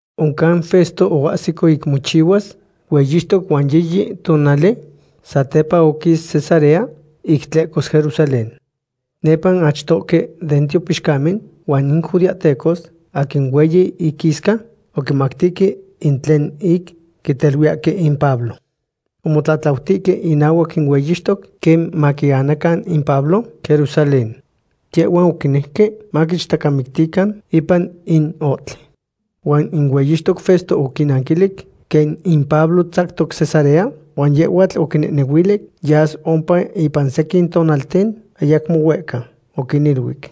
Oncan Festo oahsico ic mochihuas hueyixtoc huan yiyi tonali satepa oquis Cesarea ic tlehcos Jerusalén. Nepa in achtohque den tiopixcamen huan in judeahtecos aquin hueyi inquisca oquimactihque in tlen ic quiteluiyahque in Pablo. Omotlatlautihque inahuac in hueyixtoc quen maquianacan in Pablo Jerusalén. Yehhuan oquinejque maquichtacamictican ipan in ohtli. Huan in hueyixtoc Festo oquinnanquilic quen in Pablo tzactoc Cesarea, huan yehhuatl oquinehnehuili yas ompa ipan sequin tonalten ayacmo huehca. Oquiniluic: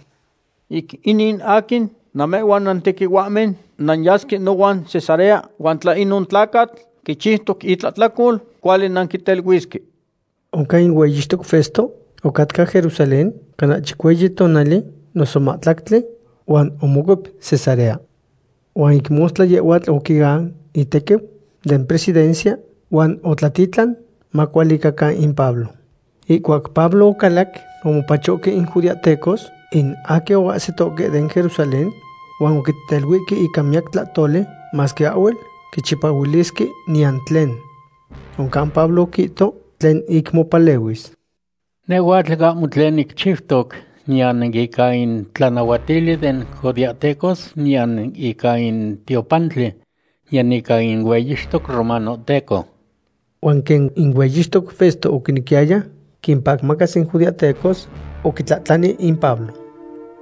―Ic inin aquin namehhuan nantequihuahmen nanyasque nohuan Cesarea, huan tla inon tlacatl quichiutoc itlahtlacol, cuali nanquiteluisque. Oncan in hueyixtoc Festo ocatca Jerusalén cana chicueyi tonali noso mahtlactli, huan omocuep Cesarea. Huan ic mostla yehhuatl oquian itequiu den presidencia huan otlatitlan macualicacan in Pablo. Ihcuac Pablo ocalac, omopachohque in judeahtecos in aquin oahsitohque den Jerusalén huan oquiteluihque ica miyac tlahtoli masque ahhuel quichipahuilisque niyan tlen. Oncan Pablo oquihto tlen ic mopalehuis: ―Nehhuatl ahmo tlen nicchiutoc, niyan ica in tlanahuatili den judeahtecos, niyan ica in tiopantli, niyan ica in hueyixtoc romanohteco. Huan quen in hueyixtoc Festo oquinequiyaya quimpacmacas in judeahtecos, oquitlahtlani in Pablo: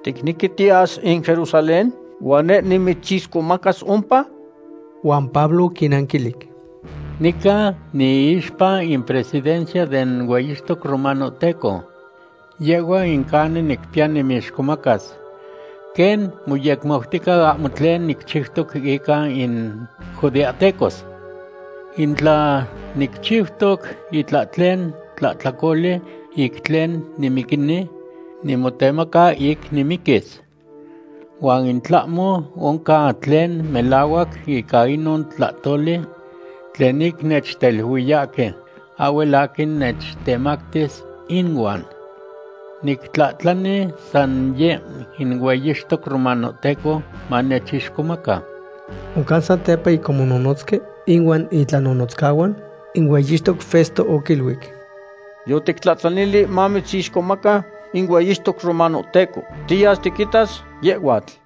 ―¿Ticnequi tiyas in Jerusalén huan neh nimitzixcomacas ompa? Huan Pablo oquinnanquilic: ―Nica niixpa in presidencia den hueyixtoc romanohteco. Yehhua in canin nicpiya nimixcomacas. Quen moyecmautica, ahmo tlen nicchiutoc ica in judeahtecos. In tla nicchiutoc itlahtlen tlahtlacoli ic tlen nimiquini, nimotemaca ic nimiquis. Huan in tlahmo oncan tlen melahuac ica inon tlahtoli tlen ic nechteluiyahque, ahhuel aquin nechtemactis inuan. Nictlahtlani san yeh in hueyixtoc romanohteco manechixcomaca. Oncan satepa ic omonohnotzque inuan itlanonotzcahuan, in hueyixtoc Festo oquiluic: ―Yotictlahtlani mamitzixcomaca in hueyixtoc romanohteco. Tiyas tiquitas yehhuatl.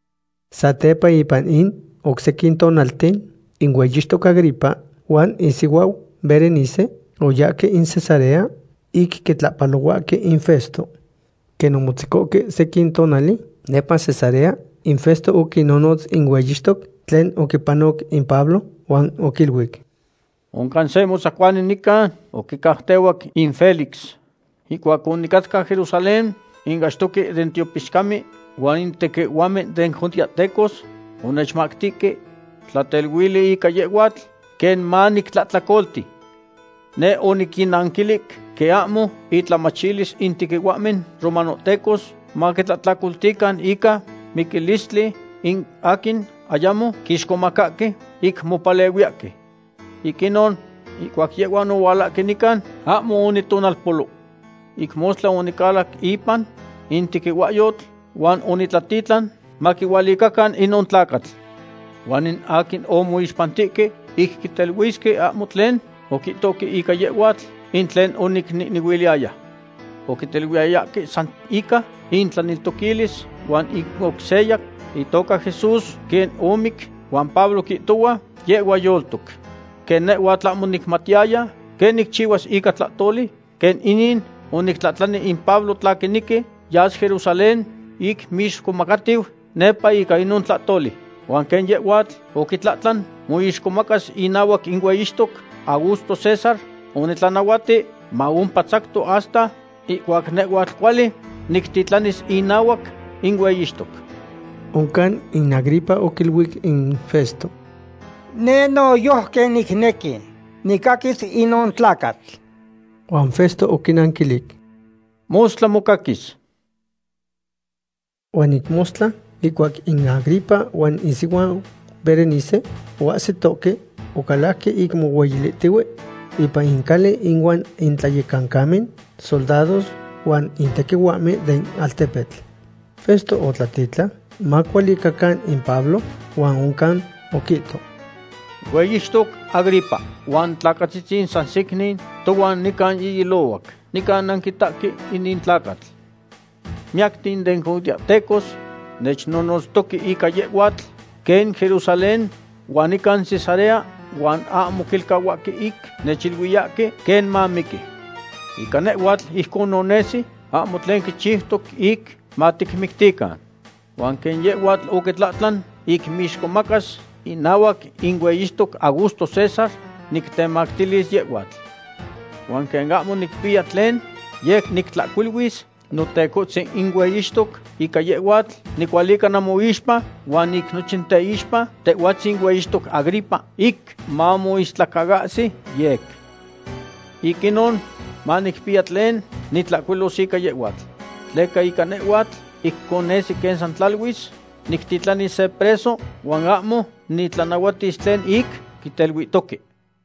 Satepa ipan in oc sequin tonalten, in hueyixtoc Agripa huan isihuau Berenice oyahque in Cesarea ic quitlahpalohuahque in Festo. Quen omotzecohque sequin tonali nepa Cesarea, in Festo oquinonotz in hueyixtoc tlen oquipanoc in Pablo, huan oquiluic: ―Oncan se motzacuani nican oquicautehuac in Félix. Ihcuac onicatca Jerusalén in achtohque den tiopixcamen huan in tequihuahmen den judeahtecos onechmactihque tlateluili ica yehhuatl, quen manictlahtlacolti. Neh oniquinnanquilic quen ahmo itlamachilis in tequihuahmen romanohtecos maquintlahtlacoltican ica miquilistli in aquin ayamo quixcomacahque, ic mopalehuiyahque. Ic inon, ihcuac yehhuan ohualahque nican, ahmo onitonalpolo. Ic mostla onicalac ipan in tequihuahyotl huan onitlatitlan maquihualicacan inon tlacatl. Huan in aquin omoixpantihque ic quiteluisque ahmo tlen oquihtohque ica yehhuatl in tlen onicnehnehuiliyaya. Oquiteluiyayahque san ica intlaneltoquilis huan ic oc seya itoca Jesús quen omic, huan Pablo quihtohua yehhua yoltoc. Quen nehhuatl ahmo onicmatiyaya quen nicchihuas ica tlahtoli quen inin, onictlahtlani in Pablo tla quinequi yas Jerusalén ic moixcomacatiu nepa ica inon tlahtoli. Huan quen yehhuatl oquitlahtlan moixcomacas inahuac in hueyixtoc Augusto César, onitlanahuati maompa tzactoc hasta ihcuac nehhuatl cuali nictitlanis inahuac in hueyixtoc. Oncan in Agripa oquiluic in Festo: ―Neh noyojqui nicnequi nicaquis inon tlacatl. Huan Festo oquinanquilic: ―Mostla mocaquis. Huan ic mostla, ihcuac in Agripa huan isihuau Berenice oahsitohque, ocalajque ic mohueyilihtihue ipan in cali inuan in tlayecancamen soldados huan in tequihuahmen den altepetl. Festo otlatitlan macualicacan in Pablo, huan oncan oquihto: ―Hueyixtoc Agripa huan tlacatzitzin san secnin tohuan nican ihilohuac, nican nanquitahque inin tlacatl. Miyacten den judeahtecos nechnonotztoque ica yehhuatl, quen Jerusalén huan nican Cesarea, huan ahmo quilcahuahque ic nechiluiyahque quen mamiqui. Ica nehhuatl ijconon nesi ahmo tlen quichiutoc ic maticmictican. Huan quen yehhuatl oquitlahtlan ic moixcomacas inahuac in hueyixtoc Augusto César, nictemactilis yehhuatl. Huan quen ahmo nicpiya tlen yec nictlahcuiluis notecohtzin in hueyixtoc ica yehhuatl, nicualica namoixpa, huan ic nochin teixpa tehhuatzin hueyixtoc Agripa, ic mamoistlacaahsi yec. Ic inon manicpiya tlen nitlahcuilos ica yehhuatl. Tleca ica nehhuatl, ijcon nesi quen san tlaluis nictitlanis se preso huan ahmo nitlanahuatis tlen ic quiteluihtoque.